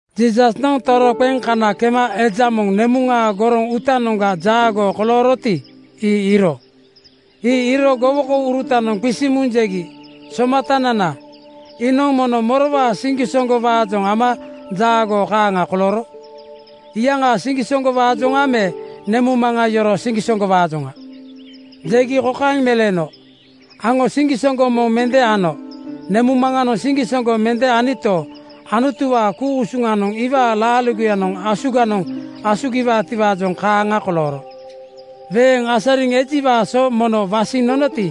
Jiisasnoŋ toroqeŋ kana kema eja moŋ nemuŋaa goroŋ uutanoŋga jaagoo kolooroti, ii iiro. Ii iiro gowokourutanoŋ qisiŋ muŋ jegi, “Somatanana, iinoŋ mono morowaa siŋgisoŋgo-waajoŋ ama jaagoo kaaŋa kolooro? Iyaŋaa siŋgisoŋgowaajoŋa me nemuŋmaŋa yoroo siŋgisoŋgowaajoŋa?” Jegi kokaeŋ meleeno, “Aŋo siŋgisoŋgo moŋ mende ano nemuŋmaŋanoŋ siŋgisoŋgo mende anito, Anutuwaa ku-usuŋanoŋ iwaa laaligoyanoŋ asuganoŋ asugiwaatiwaajoŋ kaaŋa kolooro. Weeŋ asariŋ ejiwaa so mono wasiŋ nonoti,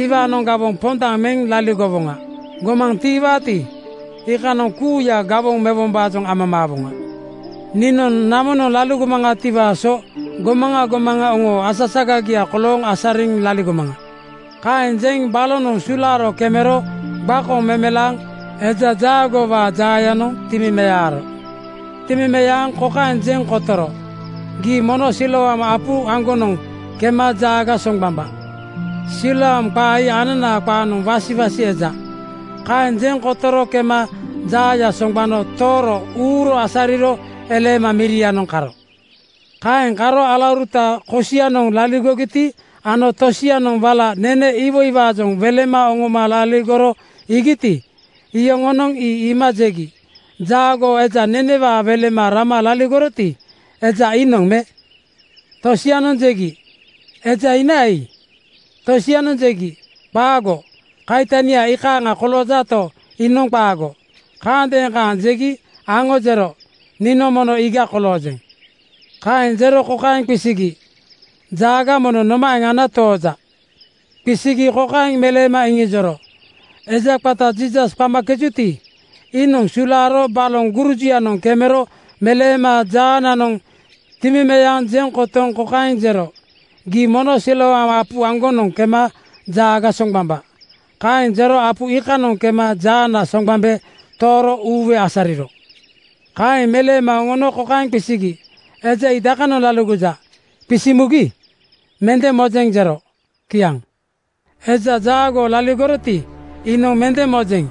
iwaanoŋ gawoŋ pondaŋ meŋ laligowoŋa. Gomaŋ tiiwaati, iikanoŋ kuuya gawoŋ mewombaajoŋ amamaawoŋa. Niinoŋ namonoŋ laligomaŋatiwaa so gomaŋa gomaŋa oŋoo asasagagia kolooŋ asariŋ laligomaŋa.” Kaeŋ jeŋ balonoŋ sulaaro kemero gbakoŋ meleema eja jaagoowaa jaayanoŋ timimearo. Timimeaŋ kokaeŋ jeŋ kotoro, “Gii mono Siloam apu aŋgonoŋ kema jaaga soŋgbambaa.” (Siloam qa ii ananaa qaanoŋ Wasiwasi eja.) Kaeŋ jeŋ kotoro kema jaaya soŋgbano tooro uuro asariro eleema mirianoŋ karo. Kaeŋ karo alauruta kosianoŋ laligogiti ano tosianoŋ wala nene iwoiwaajoŋ welema oŋoma laligoro iigiti, iyoŋonoŋ ii iima jegi, “Jaagoo eja nenewaa welema rama laligoroti, eja iinoŋ me?” Tosianoŋ jegi, “Eja inaa ii.” Tosianoŋ jegi, “Qaago, kaitania ii kaaŋa koloojato, iinoŋ qaago.” Kaandeeŋ kaaŋ jegi aŋo jero, “Niinoŋ mono iiga koloojeŋ.” Kaeŋ jero kokaeŋ qisigi, “Jaaga mono nomaeŋ ana tooja?” Qisigi kokaeŋ meleema iŋijoro, “Eja qata Jiisas qamakejuti, iinoŋ sulaaro baloŋ gurujuyanoŋ kemero meleema jaananoŋ timimeaŋ jeŋ kotoŋ kokaeŋ jero, ‘Gii mono Siloam apu aŋgonoŋ kema jaaga soŋgbambaa.’ Kaeŋ jero apu iikanoŋ kema jaana soŋgbambe tooro uuwe asariro.” Kaeŋ meleema oŋono kokaeŋ qisigi, “Eja ii dakanoŋ laligoja?” Qisiŋ mugi “Mende mojeŋ,” jero. Kiaŋ. Eja jaagoo laligoroti, iinoŋ “Mende mojeŋ,”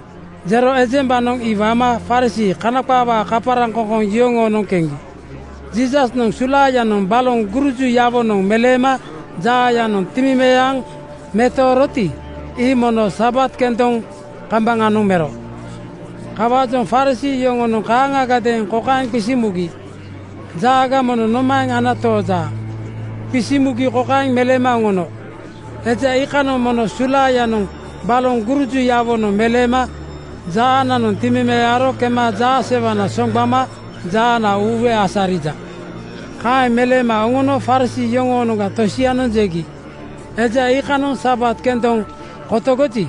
jero ejembanoŋ ii wama Farisii (Kana qaawaa kaparaŋkoŋkoŋ) yoŋoonoŋ keŋgi. Jiisasnoŋ sulaayanoŋ baloŋ gurujuyawonoŋ meleema jaayanoŋ timimeaŋ metooroti, ii mono Sabat kendoŋ kambaŋanoŋ mero. Kawaajoŋ Farisii yoŋonoŋ kaaŋagadeeŋ kokaeŋ qisiŋ mugi, “Jaaga mono nomaeŋ ana tooja?” Qisiŋ mugi kokaeŋ meleema oŋono, “Eja iikanoŋ mono sulaayanoŋ baloŋ gurujuyawonoŋ meleema jaananoŋ timimearo kema jaasewana soŋgbama jaana uuwe asarija.” Kaeŋ meleema oŋono Farisii yoŋoonoŋga tosianoŋ jegi, “Eja iikanoŋ Sabat kendoŋ kotogoji,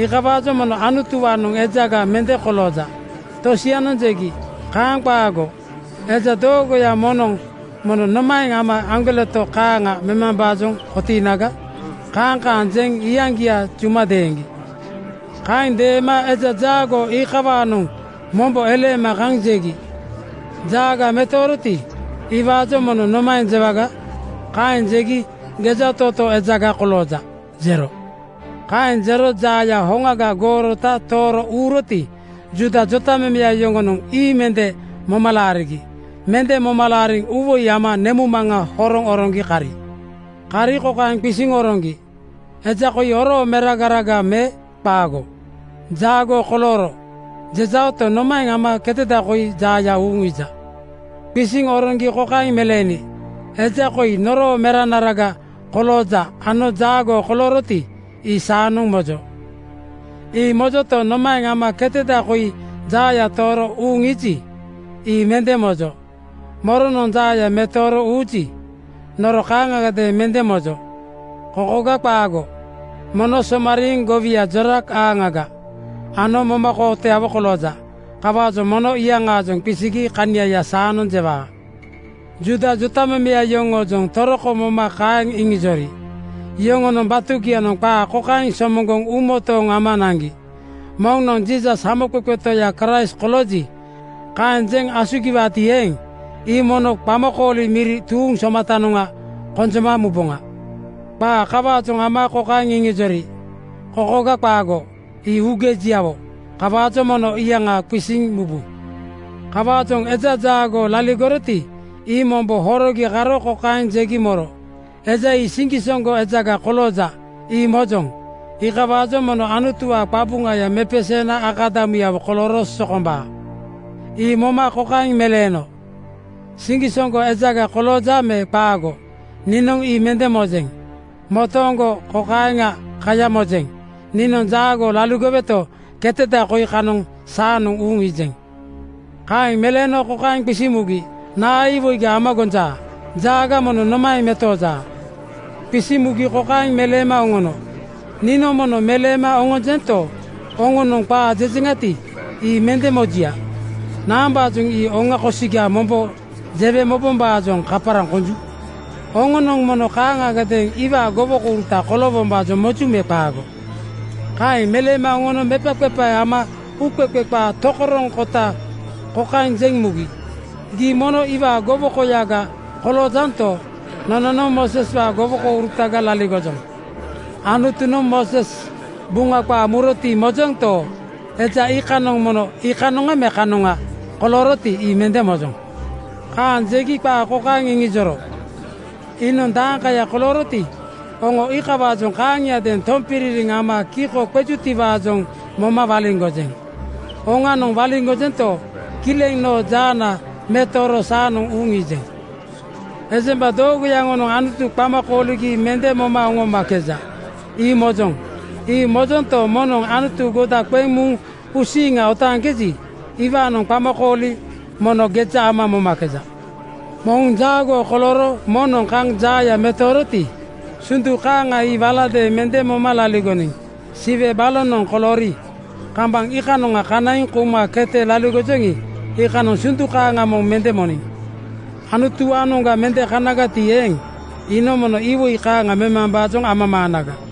iikawaajoŋ mono Anutuwaanoŋ ejaga mende kolooja.” Tosianoŋ jegi, “Kaaŋ qaago! Eja doogoya moŋnoŋ mono nomaeŋ ama aŋgoleto kaaŋa memambaajoŋ kotiinaga?” Kaaŋ kaaŋ jeŋ iyaŋgia juma deeŋgi. Kaeŋ deema eja jaagoo iikawanoŋ mombo eleema kaŋ jegi, “Jaaga metooroti, iwaajoŋ mono nomaeŋ jewaga?” Kaeŋ jegi “Gejatootoo ejaga kolooja,” jero. Kaeŋ jero jaaya hoŋaga goorota tooro uuroti, Juuda jotamemeya yoŋonoŋ ii mende moma laarigi. Mende moma laariŋ uuwoi nama nemuŋmaŋa horoŋ oroŋgi kari. Kari kokaeŋ qisiŋ oroŋgi, “Eja koi oroo meragaraga me qaago? ‘Jaagoo kolooro,’ jejaoto, nomaeŋ ama keteda koi jaaya uuŋ iija?” Qisiŋ oroŋgi kokaeŋ meleeni, “Eja koi noroo meranaraga kolooja ano jaagoo kolooroti, ii saanoŋ mojo. Ii mojoto, nomaeŋ ama keteda koi jaaya tooro uuŋ iiji, ii mende mojo. Moronoŋ jaaya metooro uuji, noro kaaŋagadeeŋ mende mojo. Kokoga qaago, mono somariiŋ gowia jorak-aaŋaga ano momakootoyawo kolooja. Kawaajoŋ mono iyaŋaajoŋ qisigi kaniaya saanoŋ jewaa.” Juuda jotamemeya yoŋoojoŋ toroko moma kaeŋ iŋijori. Yoŋonoŋ batugianoŋ qaa kokaeŋ somoŋgoŋ uumotooŋgo ama naŋgi, “Moŋnoŋ ‘Jiisas Hamoqeqe Toya Kraist kolooji,’ kaeŋ jeŋ asugiwaati eeŋ, ii mono qamakooli miri tuuŋ somatanoŋga konjoma muboŋa.” Qaa kawaajoŋ ama kokaeŋ iŋijori, “Kokoga qaago, ii uugejiawo. Kawaajoŋ mono iyaŋa qisiŋ mubu.” Kawaajoŋ eja jaagoo laligoroti, ii mombo horogi karo kokaeŋ jegi moro, “Eja ii siŋgisoŋgo ejaga kolooja, ii mojoŋ. Iikawaajoŋ mono Anutuwaa qabuŋaya mepeseena akadamuyawo kolooro sokombaa.” Ii moma kokaeŋ meleeno, “Siŋgisoŋgo ejaga kolooja me qaago, niinoŋ ii mende mojeŋ. Motooŋgo kokaeŋa kaya mojeŋ: Niinoŋ jaagoo laligoweto, keteda koi kanoŋ saanoŋ uuŋ iijeŋ.” Kaeŋ meleeno kokaeŋ qisiŋ mugi, “Naa iwoiga ama gonja? Jaaga mono nomaeŋ metooja?” Qisiŋ mugi kokaeŋ meleema oŋono, “Niinoŋ mono meleema oŋonjento, oŋonoŋ qaa jejeŋati, ii mende mojuya. Naambaajoŋ ii oŋa kosiga mombo jewe mobombaajoŋ kaparaŋ konju? Oŋonoŋ mono kaaŋagadeeŋ iwaa gowokouruta koloowombaajoŋ moju me qaago?” Kaeŋ meleema oŋono mepaqepae ama uuqeqe qaa tokoroŋkota kokaeŋ jeŋ mugi, “Gii mono iwaa gowokoyaga koloojanto, nononoŋ Mooseswaa gowokourutaga laligojoŋ. Anutunoŋ Mooses Buŋa qaa muroti mojonto, eja iikanoŋ mono iikanoŋa me kanoŋa kolooroti, ii mende mojoŋ.” Kaeŋ jegi qaa kokaeŋ iŋijoro, “Iinoŋ dakaya kolooroti, oŋo iikawaajoŋ kaaŋiadeeŋ tompiririŋ ama kiko qejutiwaajoŋ moma waliŋgojeŋ. Oŋanoŋ waliŋgojento, kileŋ noo jaana metooro saanoŋ uuŋ iijeŋ. Ejemba doogoya yoŋonoŋ Anutu qama kooligi mende moma oŋomakeja, ii mojoŋ. Ii mojonto, moŋnoŋ Anutu goda qeŋ muŋ uusiiŋa otaaŋkeji, iwaanoŋ qamakooli mono geja ama momakeja. Moŋ jaagoo kolooro moŋnoŋ kaŋ jaaya metooroti, sundu kaaŋa ii walagadeeŋ mende moma laligoniŋ. Siwe balonoŋ koloori, kambaŋ iikanoŋa kanaiŋ kouma kete laligojoŋi, iikanoŋ sundu kaaŋa moŋ mende moniŋ. Anutuwaanoŋga mende kanagati eeŋ, iinoŋ mono iwoi kaaŋa memambaajoŋ amamaanaga.”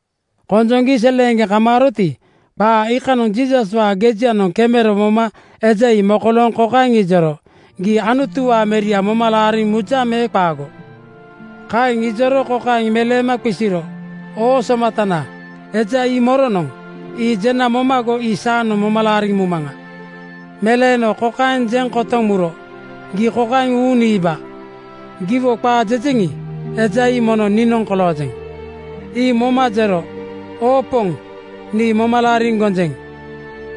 Konjoŋgi seleeŋgeŋ kamaaroti, qaa iikanoŋ Jiisaswaa gejianoŋ kemero moma eja ii mokolooŋ kokaeŋ ijoro, “Gii Anutuwaa Meria moma laariŋ mujaŋ me qaago?” Kaeŋ ijoro kokaeŋ meleema qisiro, “Oo Somatana, eja ii moronoŋ? Ii jena momago ii saanoŋ moma laariŋ mumaŋa.” Meleeno kokaeŋ jeŋ kotoŋ muro, “Gii kokaeŋ uuŋ niiba. Giwo qaa jejeŋi, eja ii mono niinoŋ koloojeŋ.” Ii moma jero, “Oo Poŋ, nii moma laariŋ gonjeŋ.”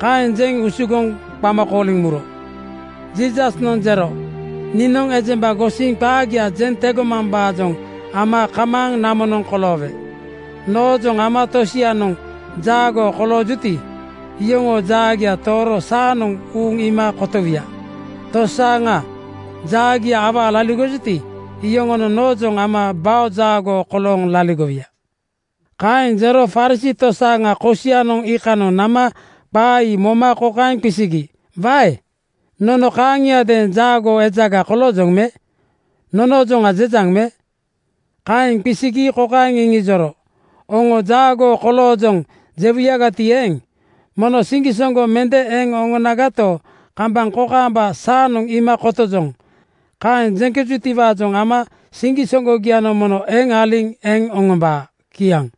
Kaeŋ jeŋ usugoŋ qama kooliŋ muro. Jiisasnoŋ jero, “Niinoŋ ejemba gosiŋ qaagia jeŋ tegomambaajoŋ ama kamaaŋ namonoŋ koloowe. Noojoŋ ama tosianoŋ jaagoo koloojuti, yoŋoo jaagia tooro saanoŋ uuŋ iima kotowuya. Tosaaŋa jaagia awaa laligojuti, yoŋonoŋ noojoŋ ama bao jaagoo kolooŋ laligowuya.” Kaeŋ jero Farisii tosianoŋ kosianoŋ iikanoŋ nama qaa ii moma kokaeŋ qisigi, “Wae! Nono kaaŋiadeeŋ jaagoo ejaga koloojoŋ me? Nonoojoŋa jejaŋ me?” Kaeŋ qisigi kokaeŋ iŋijoro, “Oŋo ‘Jaagoo koloojoŋ,’ jewuyagati eeŋ, mono siŋgisoŋgo mende eŋ oŋonagato, kambaŋ kokaamba ‘Saanoŋ iima kotojoŋ,’ kaeŋ jeŋkejutiwaajoŋ ama siŋgisoŋgogianoŋ mono eŋ aliŋ eŋ oŋombaa.” Kiaŋ.